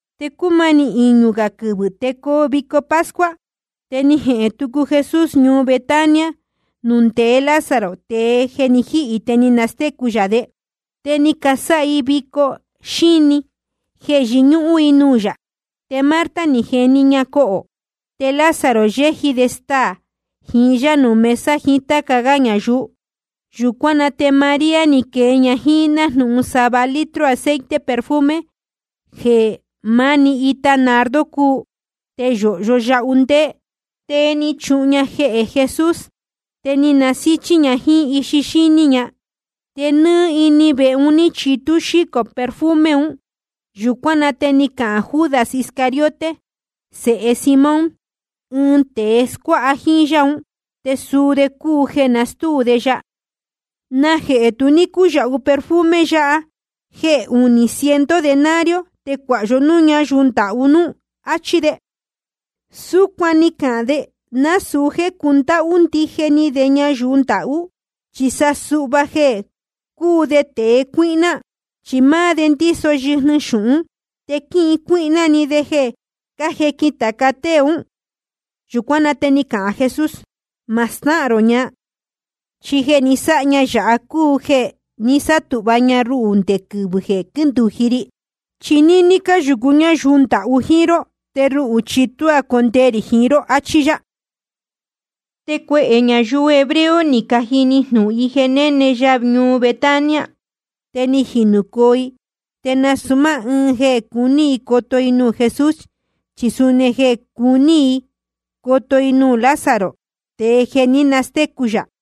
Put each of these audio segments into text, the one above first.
Te cúmanī iñū gā quɨvɨ̄ te coo vico pascua. Te ni jehēn tucu Jesús ñuu Betania nuū ndeé Lázaro, tēe ni jihī te ni nastécu yā de. Te ni casáha i ɨɨn vico xíni jeē yɨñúhún i jíín yá. Te Marta ni jeni ña cohō. Te Lázaro yéji de staā jiín yá nuū mesa jiín táca gá ñayuu. Yūcuán na te María ni quee ña jíín nájnūhun sava litro aceite perfume jeē máni ita nardo cúu, te yōhyo yahu ndéé. Te ni chuhun ña jehē Jesús, te ni nasíchí ña jíín ixi ña. Te nɨ́ɨ́ ini vehe un ní chitú xícō perfume un. Yūcuán na te ni cahān Judas Iscariote sēhe Simón, ɨɨn tēe scuáha jíín yá un, te suu de cúu jeē nastúu de ya: ¿Najehē tu ní cúyāhu perfume yáha jéē uní ciento denario, te cuāha yó núū ñáyuu ndahú núú. Achí de. Súcuan ni cahān de, nasūu jéē cundáhú ndije ni de ñayuu ndahú, chi sa suhva jeē cúu de tēe cuíhná. Chi máá de ndíso yɨjnɨ xūhún, te quíhin cuíhná de jeē cájequin tāca tée ún. Yūcuán na te ni cahān Jesús: Ma stáhān rō ña. Chi jeē ni sáha ña yāhá cúu jeē ni sátūhva ña ruhū nde quɨvɨ̄ jeē quíndūji ri. Chi níní cáyūcu ñáyuu ndahú jíín ró, te ruhū chi tuá condee rī jiín ró. Achí yá. Te cuehē ñayuu hebreo ni cajini jnūhun i jeē néne ya ñuu Betania. Te ni jinūcoo i, te nasūu máá ɨɨn jeē cuní i coto i nuū Jesús, chi suni jeē cuní i coto i nuū Lázaro, tēe jeē ní nastécu yā.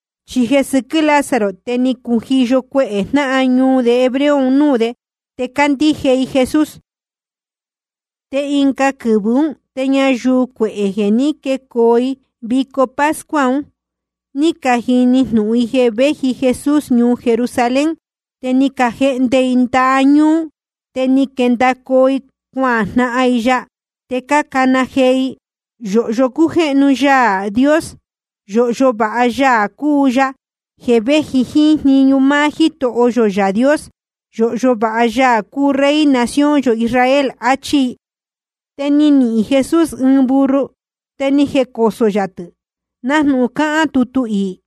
Chi jeē sɨquɨ́ Lázaro te ni cujiyo cuehē jnáhan ñuu de hebreo nuū de, te cácandíje i Jesús. Te ɨnga quɨvɨ̄ ún, te ñayuu cuehē jeē ní quecoo vico pascua un, ní cajini jnūhun i jeē véji Jesús ñuu Jerusalén. Te ni cajehnde i ndaha ñúú, te ni quendacoo i cuajnahan i ya. Te cácana jee i: Yōhyo cújéhnu Yaā Dios. Yōhyo vāha Yaā cúu Yaā jeē véji jíín jniñu máá Jítoho yō Yaā Dios. Yōhyo vāha Yaā cúu Rey nación yō Israel. Achí i. Te ni nihīn Jesús ɨɨn burro, te ni jecosō yā tɨ̄, nájnūhun cáhán tutu iī: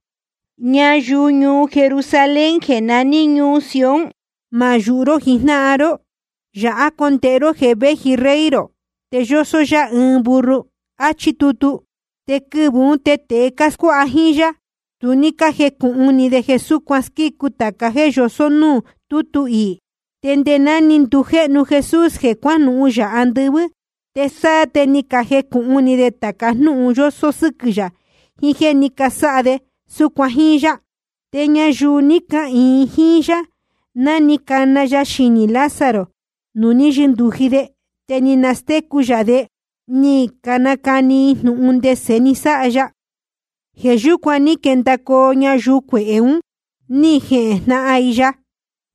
Ñayuu ñuu Jerusalén jeē naní ñuu Sion, ma yūhu ró jijnáhan ró. Yāhá condēhe ró jeē véji Rey rō, te yósó yá ɨɨn burro. Achí tutu. Te quɨvɨ̄ ún te tēe cáscuáha jíín yá, tu ní cájecūhun ni de jeē súcuan squícu tāca jéē yosó núū tútu iī. Te nde ná ni ndujéhnu Jesús jeē cuánuhun yā andɨvɨ́, te sáá te ni canucūhun ni de tāca jnúhun yósó sɨ́quɨ̄ yā, jiín jéē ní casáha de súcuan jíín yá. Te ñayuu ní cahīin jíín yá ná ni cana ya xinī Lázaro nuū ní yɨndūji de, te ni nastécu yā de, ni canacani i jnūhun ndese ni sáha ya. Jeē yúcuan ní quendacoo ñayuu cuehē un, ní jejnahan i ya,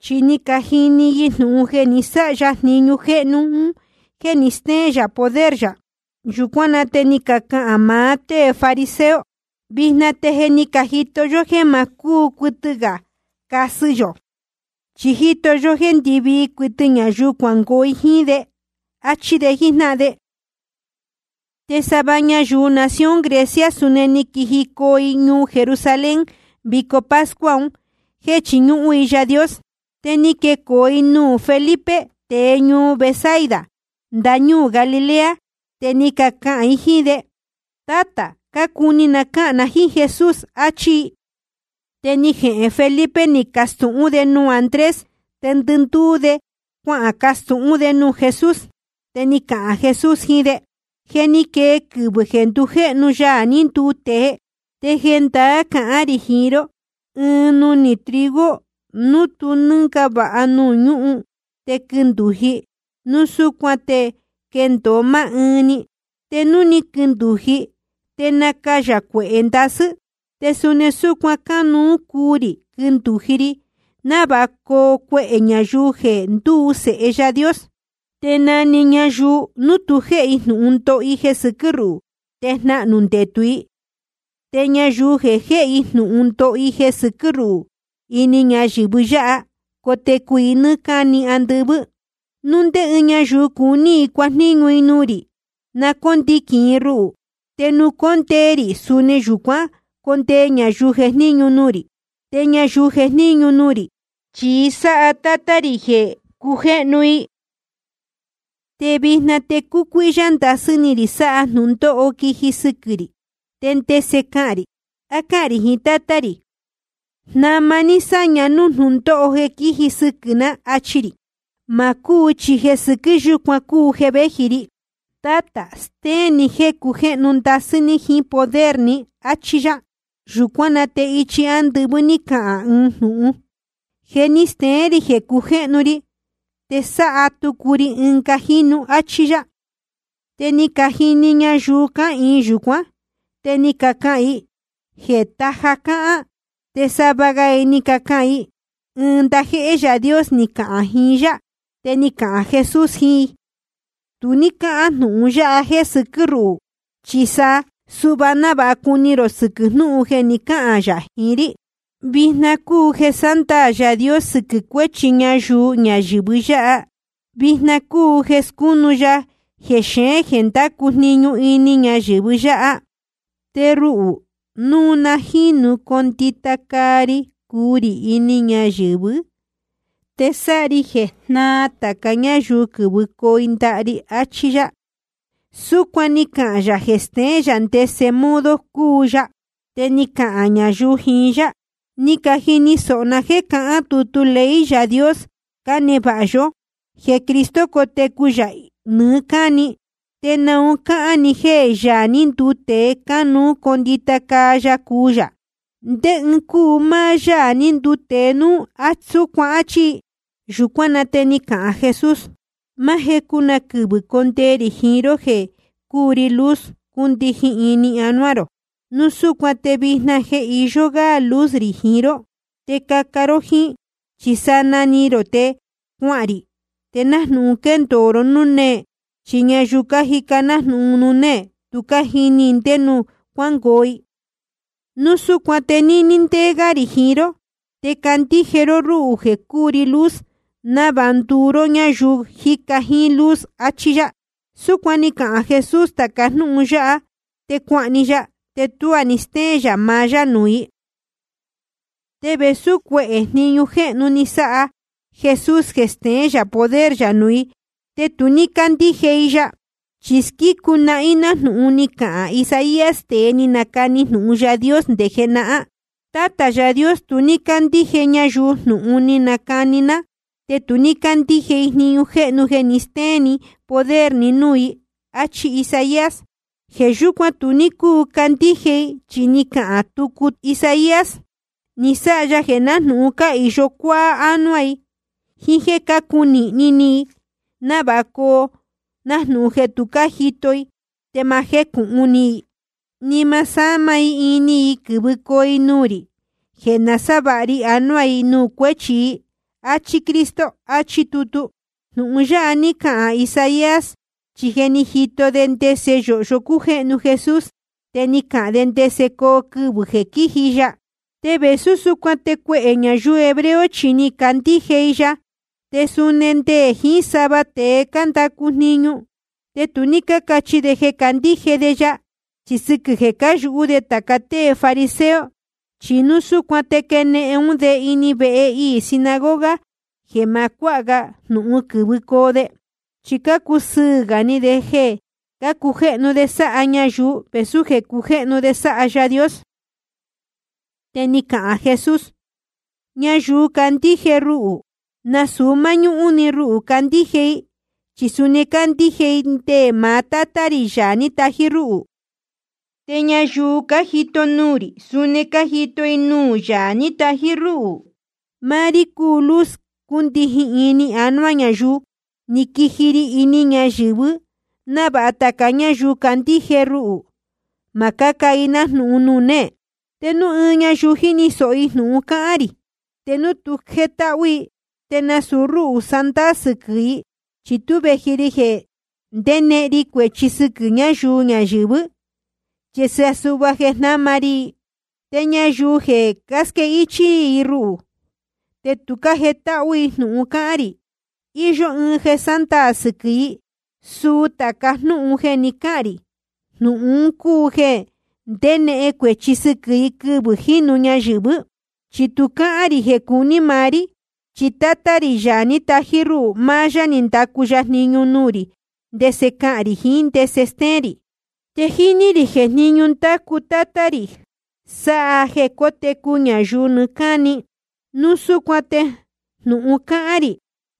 chi ni cajini jnūhun i jeē ni sáha ya jniñu jéhnu un jéē ni steén yā poder yā. Yūcuán na te ni cacahān maá tée fariseo: Vijna te je ni cajito yó jéē ma cúu cuɨtɨ gā casɨ yō. Chi jíto yó jéē ndɨvii cuɨtɨ ñayuu cuangoo i jíín de. Achí de jíjnáhan de. Te sava ñayuu nación Grecia, suni ni quijicoo i ñuu Jerusalén vico pascua un jéē chiñúhún i Yaā Dios. Te ni quecoo i nuū Felipe, tēe ñuu Betsaida ndañúū Galilea. Te ni cacahān i jíín de: Tátā, cácuni ná cahān na jíín Jesús, achí i. Te ni jehēn Felipe, ni castūhún de nuū Andrés. Te ndɨndúú de cuacastūhún de nuū Jesús. Te ni cahān Jesús jiín de: Je ni quee quɨvɨ̄ jeē ndujéhnu Yaā ní nduu tēe. Te jendaá cahán rī jiín ró, ɨɨn nunī trigo núu tú nɨngava nuū ñúhun te quindūji, núu súcuan te quendōo máá ɨɨn‑ni. Te núu quindūji, te nacayā cuehē ndasɨ́. Te suni súcuan cánuú cuu rī quindūji ri, návāha coo cuehē ñayuu jeē ndúu i sēhe Yaā Dios. Te na‑ni ñayuu núu tu jéhe i jnūhun ndoho i jeē sɨquɨ́ ruhū, te jnahnū ndetū i. Te ñayuu jeē jéhe i jnūhun ndoho i jeē sɨquɨ́ ruhū ini ñayɨ̄vɨ yáha, cotecu i nɨ́ɨ́ cáni andɨvɨ́. Núu ndé ñáyuu cuní i cuajníñu i nuū rī, na cóndiquīn i ruhū. Te nuū cóndee rī, suni yūcuán condee ñayuu jejníñu nuū rī. Te ñayuu jejníñu nuū rī, chi sáha Tátá rī jeē cujéhnu i. ’Te vijna te cúcuíhyá ndasɨ́ ni rī sáha jnūndóho quiji sɨquɨ̄ rī. ¿Te ndese cahān rī? ¿A cáhān rī jiín Tátá rī: Jnama ní sáña núū jnúndóho jeē quíji sɨquɨ̄ ná, achi rī? Ma cúu, chi jeē sɨquɨ́ yúcuan cúu jeē véji ri. Tátā, stéén ni jéē cujéhnu ndasɨ́ ní jiín poder ni, áchí yá. Yūcuán na te ichi ándɨvɨ́ ní cahān ɨɨn jnūhun: Je ni steén rī jeē cujéhnu ri, te sáha tucu ri ɨnga jínu, áchí yá. Te ni cajini ñayuu cáhīin yūcuán, te ni cacahān i jeē taja cáhán. Te sava ga i ni cacahān: Ɨɨn ndajéhé Yaā Dios ni cahān jiín yá. Te ni cahān Jesús jiín i: Tu ní cáhán jnūhun yáha jéē sɨquɨ́ ruhū, chi sa suhva návāha cuni rō sɨquɨ̄ jnúhun jeē ni cáhān yā jiín rí. Vijna cúu jeē sándaā Yaā Dios sɨquɨ̄ cuéchi ñayuu ñayɨ̄vɨ yáha. Vijna cúu jeē scúnu ya jexeén jeē ndácu jniñu ini ñayɨ̄vɨ yáha. Te ruhū, núu na jínu condita caa ri cuu rī ini ñayɨ̄vɨ́, te sáha ri jeē jnáā tāca ñáyuu quɨ̄vɨcoo i ndaha ri, achí yá. Súcuan ni cahān yā jeē steén yā ndese modo cuu yā. Te ni cacahān ñayuu jiín yá: Ni cajini sōho ná jéē cahán tutu ley Yaā Dios cánevāha yó, jeē Cristo cotecu yā nɨɨ́ cáni. ¿Te naun cáhán ni jéē Yaā ní nduu tēe, cánuú condita caa ya cuu yā? ¿Ndé ɨɨn cúu máá Yáā ní nduu tēe núu súcuan? Achí i. Yūcuán na te ni cahān Jesús: Máá jecu na quɨvɨ̄ condee rī jiín ró jeē cúu ri luz cundijin ini anuá rō. Núu súcuan te vijna jeē iyó gá luz rī jiín ró, te caca ró jíín, chi sanaa ni rō te cuahān rī, te nájnūhun quendōo ró núū néē. Chi ñayuu cájica nájnūhun nuū néē, tu cájini i ndé nuū cuángoo i. Núu súcuan te níní ndéé gá rī jiín ró, te candíje ró rúhū jeē cúu ri luz, návāha nduu ró ñáyuu cájica jíín luz, achí yá. Súcuan ni cahān Jesús tāca jnúhun yáha, te cuahān‑ni ya, te tuá ni stéén yā maá yá nuū i. Te vēsú cuehē jniñu jéhnu ni sáha Jesús jeē steén yā poder yā nuū i, te tu ní cácandíje i ya. Chi squícu nahín jnúhun ni cahān Isaías, tēe ni nacani jnūhun Yaā Dios nde jenahán: Tátā Yaā Dios, tu ní cácandíje ñayuu jnūhun ni canacani ná, te tu ní cácandíje i jniñu jéhnu jeē ni stéén ni poder ni núū i. Achí Isaías. Jeē yúcuan tu ní cúu candíje i, chi ni cahān tucu Isaías: Ni sáha ya jeē nájnūhun cáhīyo cuáá ánuá i, jíín jéē cácunīhni ni i, návāha coo nájnūhun jeē tu cájito i, te ni ma jécūhun ni i, ni ma násāma ini i quɨ̄vɨcoo i nuū rī, jeē nasávāha ri anuá i nuū cuéchi i. Achí Cristo, achí tutu. Jnūhun yáha ní cahān Isaías, chi je ni jito de ndese yōhyo cújéhnu Jesús, te ni cahān de ndese coo quɨvɨ̄ jeē quíji ya. Te vēsú súcuan te cuehē ñayuu hebreo chi ni cacandíje i ya, te suni nde jiín sava tēe cándacu jniñu. Te tu ní cácachi de jeē cácandíje de ya, chi sɨquɨ̄ jeē cáyūhú de tāca tée fariseo. Chi núu súcuan te quenehen ún de ini vehe iī sinagoga jeē ma cuáha ga jnūhun quɨ̄vɨcoo de. Chi cácusɨɨ̄ gā ni de jeē cujéhnu de sáha ñayuu, vēsú jeē cujéhnu de sáha Yaā Dios. Te ni cahān jee Jesús: Ñayuu cácandíje ruhū, nasūu máñúhún‑ni ruhū cácandíje i, chi suni cácandíje i nde maá Tátá rī, Yaā ní tají rúhū. Te ñayuu cájito nuū rī, suni cájito i nuū Yaā ní tají rúhū. Máá rí jeē cúu ri luz cúndijin ini anuá ñayuu, ni quiji ri ini ñayɨ̄vɨ návāha tāca ñáyuu cácandíje ruhū, ma cáca i nájnūhun nuū néē. Te núu ɨɨn ñayuu jíni sōho i jnūhun cáhán rī, te núu tu jétáhú i, te nasūu rúhū sándaā sɨquɨ̄ i. Chi tú vēji ri jeē ndénehen ri cuēchi sɨquɨ̄ ñayuu ñayɨ̄vɨ́, chi sa suhva jeē jnáma ri i. Te ñayuu jeē casquéhichī i ruhū te tu cájetáhú i jnūhun cáhán rī, íyó ɨɨn jeē sándaā sɨquɨ̄ i. Suu tāca jnúhun jeē ni cáhān rī, jnūhun un cúu jeē ndenehen cuēchi sɨquɨ̄ i quɨvɨ̄ jínu ñayɨ̄vɨ́. Chi tu cáhán rī jeē cúu ni maá rí, chi Tátá rī, Yaā ní tají rúhū, máá yá ni ndacu jniñu nuū rī ndese cahān rī jiín ndese stéén rī. Te jíní rī jeē jniñu ndácu Tátá rī sáha jeē cótecu ñayuu nɨɨ́ cáni. Núu súcuan te jnūhun cáhán rī,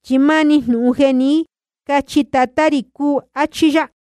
chi máni jnūhun jeē ní cachi Tatá rī cúu, áchí yá.